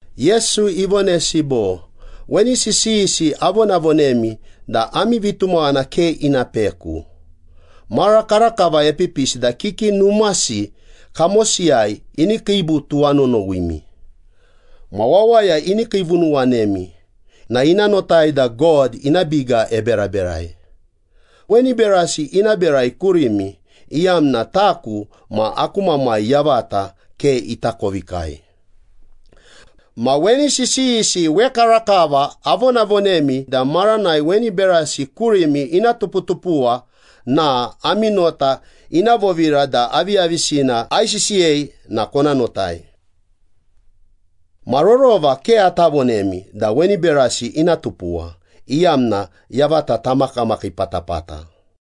Yesu ivonesi bo, “Weni sisiyisi avonavonemi da ami vitumaghana ke ina peku. Mara karakava epipisi da kiki numasi kamosiyai ini kiibu tuwanonowimi. Ma wawaya ini kiivunuwanemi na ina notai da God ina biga eberaberai. Weni berasi ina berai kurimi iyamna taku ma aku Mamai yavata ke itakovikai. Ma weni sisiyisi wekarakava avonavonemi da maranai weni berasi kurimi ina tuputupuwa na ami nota ina vovira da aviyavisina aisisiyei na kona notai. Ma rorova ke ata vonemi da weni berasi ina tupuwa, iyamna yavata tamakamakii patapata.”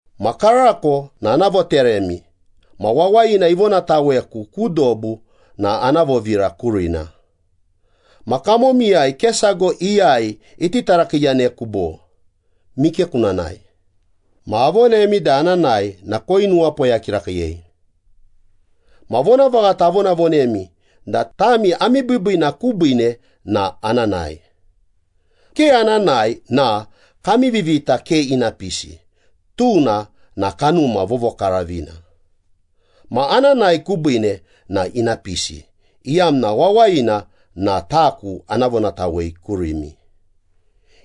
“Ma karako na ana voteremi ma wawayina ivonataweku ku dobu na ana vovira kurina. Ma kamomiyai ke sago iyai iti tarakiiyaneku bo, ‘Mike kuna nae?’ Ma avonemi da ana nae na koinuwapoya kirakiiyei. Ma vonavaghata avonavonemi da tami ami biibiina kubiine na ana nae. Ke ana nae na kami Vivita ke ina pisi, tuna na Kanuma Vovokaravina. Ma ana nae kubiine na ina pisi, iyamna wawayina na taku ana vonatawei kurimi.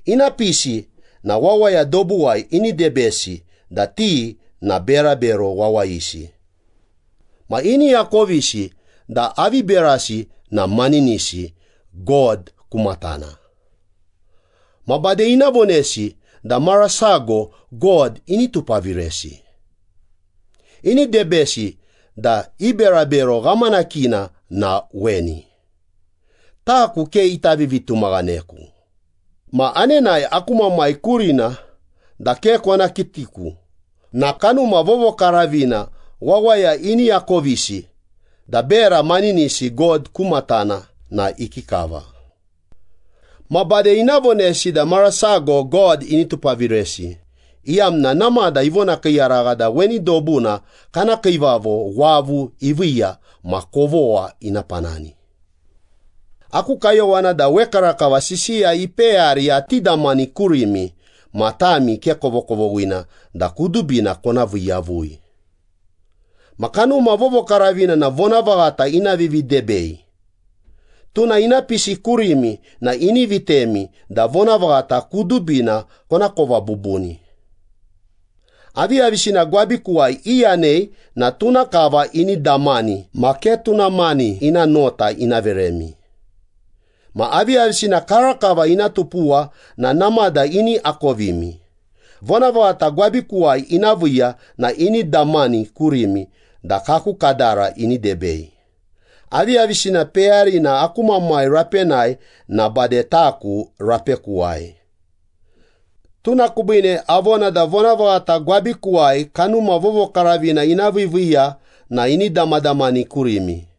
Ina pisi na wawaya dobuwai ini debesi da ti na berabero wawayisi. Ma ini akovisi da avi berasi na maninisi God ku matana. Ma bade ina vonesi da mara sago God ini tupaviresi. Ini debesi da i berabero ghamanakina na weni, taku ke ita vivitumaghaneku. Ma anenae aku Mamai kurina da ke kona kitiku na Kanuma Vovokaravina wawaya ini akovisi da bera maninisi God ku matana na ikikava. Ma bade ina vonesi da mara sago God ini tupaviresi, iyamna namada ivonakiiyaragha da weni dobuna kana kiivavo wavu iviiya ma kovogha ina panani.” “Aku kayowana da wekarakava sisiya ipeyari ati damani kurimi ma tami ke kovokovoghina da kudubina kona vii yavui. Ma Kanuma Vovokaravina na vonavaghata ina vividebei. Tuna ina pisi kurimi na ini vitemi da vonavaghata kudubina konakova bubuni. Aviyavisina gwabikuwai iyanei na tuna kava ini damani ma ke tuna mani ina nota ina veremi. Ma aviyavisina karakava ina tupuwa na namada ini akovimi. Vonavaghata gwabikuwai ina viiya na ini damani kurimi da kaku kadara ini debei. Aviyavisina peyarina aku Mamai rapenai na bade taku rapekuwai. Tuna kubiine avona da vonavaghata gwabikuwai Kanuma Vovokaravina ina viiviiya na ini damadamani kurimi.”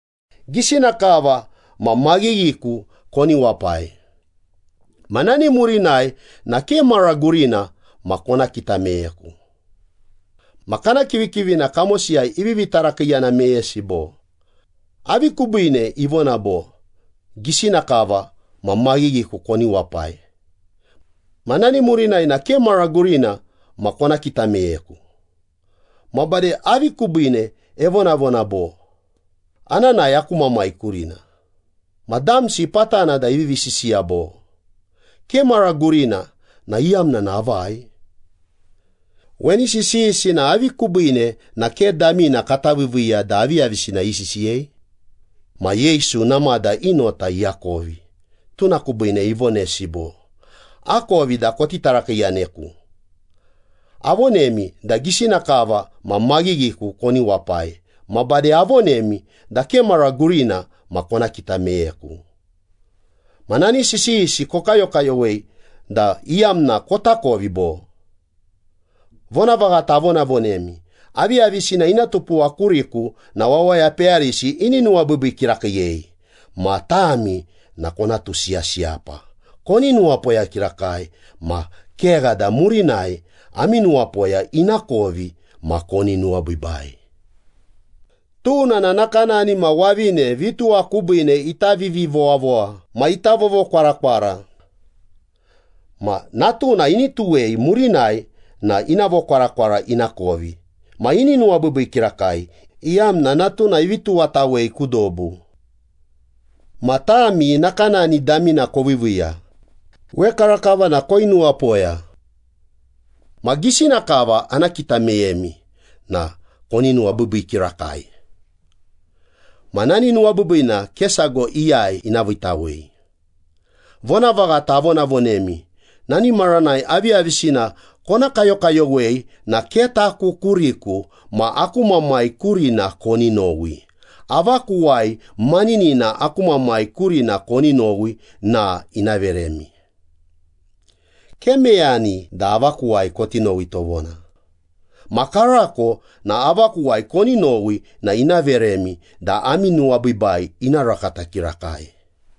“Gisina kava ma maghighiku koni wapai. Ma nani murinai na ke mara gurina ma kona kita meyeku.” Ma kana kivikivina kamosiyai ivivi tarakiiyana meyesi bo, “Avi kubiine ivona bo, ‘Gisina kava ma maghighiku koni wapai. Ma nani murinai na ke mara gurina ma kona kita meyeku?’ Ma bade avi kubiine evonavona bo, ‘Ana nae aku Mamai kurina.’” Ma damsi patana da ivivi sisiya bo, “‘Ke mara gurina’ na iyamna avai? Weni sisiyisi na avi kubiine na ke damina kata viiviiya da aviyavisina isisiyei?” Ma Yesu namada i nota iakovi, tuna kubiine ivonesi bo, “Akovi da koti tarakiiyaneku. Avonemi da gisina kava ma maghighiku koni wapai ma bade avonemi da ke mara gurina ma kona kita meyeku. Ma nani sisiyisi kokayokayowei da iyamna kotakovi bo? Vonavaghata avonavonemi, aviyavisina ina tupuwa kuriku na wawaya peyarisi ini nuwabiibii kirakiiyei. Ma tami na kona tusiyasiyapa. Koni nuwapoya kirakai ma kegha da murinai ami nuwapoya ina kovi ma koni nuwabiibai. Tuna na nakanani ma wavine vituwa kubiine ita vivivowavowa ma ita vovokwarakwara. Ma natuna ini tuwei murinai na ina vokwarakwara ina kovi ma ini nuwabiibii kirakai, iyamna natuna ivi tuwatawei ku dobu. Ma tami nakanani damina koviiviiya, wekarakava na koinuwapoya. Ma gisina kava ana kita meyemi na koni nuwabiibii kirakai. Ma nani nuwabiibiina ke sago iyai ina viitawei.” “Vonavaghata avonavonemi, nani maranai aviyavisina kona kayokayowei na ke taku kuriku ma aku Mamai kurina koni nowi. Avakuwai maninina aku Mamai kurina koni nowi na ina veremi. Ke meyani da avakuwai koti nowi tovona. Ma karako na avakuwai koni nowi na ina veremi da ami nuwabiibai ina rakata kirakai.”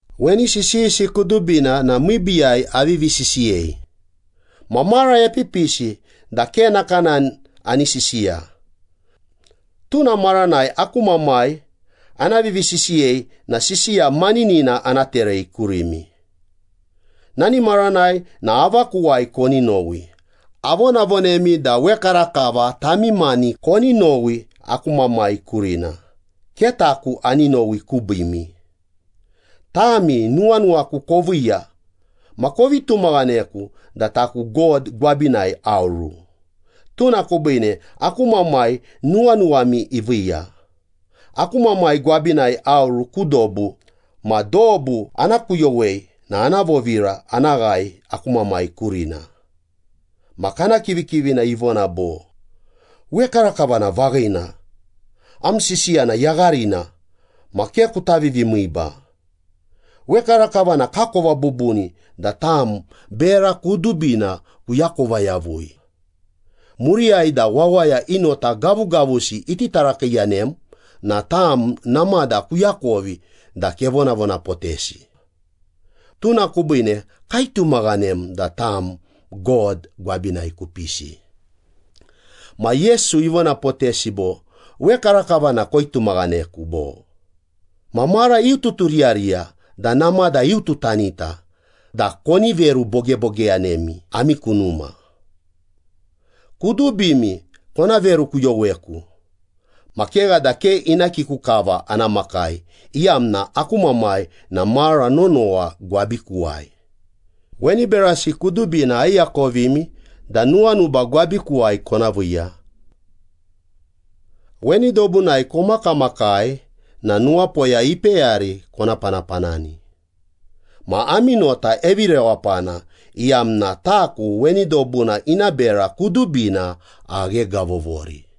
“Weni sisiyisi kudubina na miibiiyai avivi sisiyei. Ma mara epipisi da ke nakanani ani sisiya. Tuna maranai aku Mamai ana vivisisiyei na sisiya maninina ana terei kurimi. Nani maranai na avakuwai koni nowi. Avonavonemi da wekarakava tami mani koni nowi aku Mamai kurina, ke taku ani nowi kubiimi. Tami nuwanuwaku koviiya ma kovi tumaghaneku da taku God gwabinai aoru. Tuna kubiine aku Mamai nuwanuwami iviiya. Aku Mamai gwabinai aoru ku dobu, ma dobu ana kuyowei na ana vovira ana ghae aku Mamai kurina.” Ma kana kivikivina ivona bo, “Wekarakava na vaghina, am sisiya na yagharina ma ke kuta vivimiiba. Wekarakava na kakova bubuni da tam bera kudubina kuakova yavui. Muriyai da wawaya i nota gavugavusi iti tarakiiyanem na tam namada kuakovi da kevonavonapotesi. Tuna kubiine kaitumaghanem da tam God gwabinai kupisi.” Ma Yesu ivonapotesi bo, “Wekarakava na koitumaghaneku, bo? Ma mara iututuriyariya da namada iututanita da koni verubogebogeyanemi ami ku numa. Kudubimi kona verukuyoweku. Ma kegha da ke ina kiku kava ana makai, iyamna aku Mamai na mara nonowa gwabikuwai. Weni berasi kudubina aiakovimi da nuwanuba gwabikuwai kona viiya. Weni dobunai komakamakai na nuwapoya ipeyari kona panapanani. Ma ami nota evirewapana, iyamna taku weni dobuna ina bera kudubina aghegavovori.”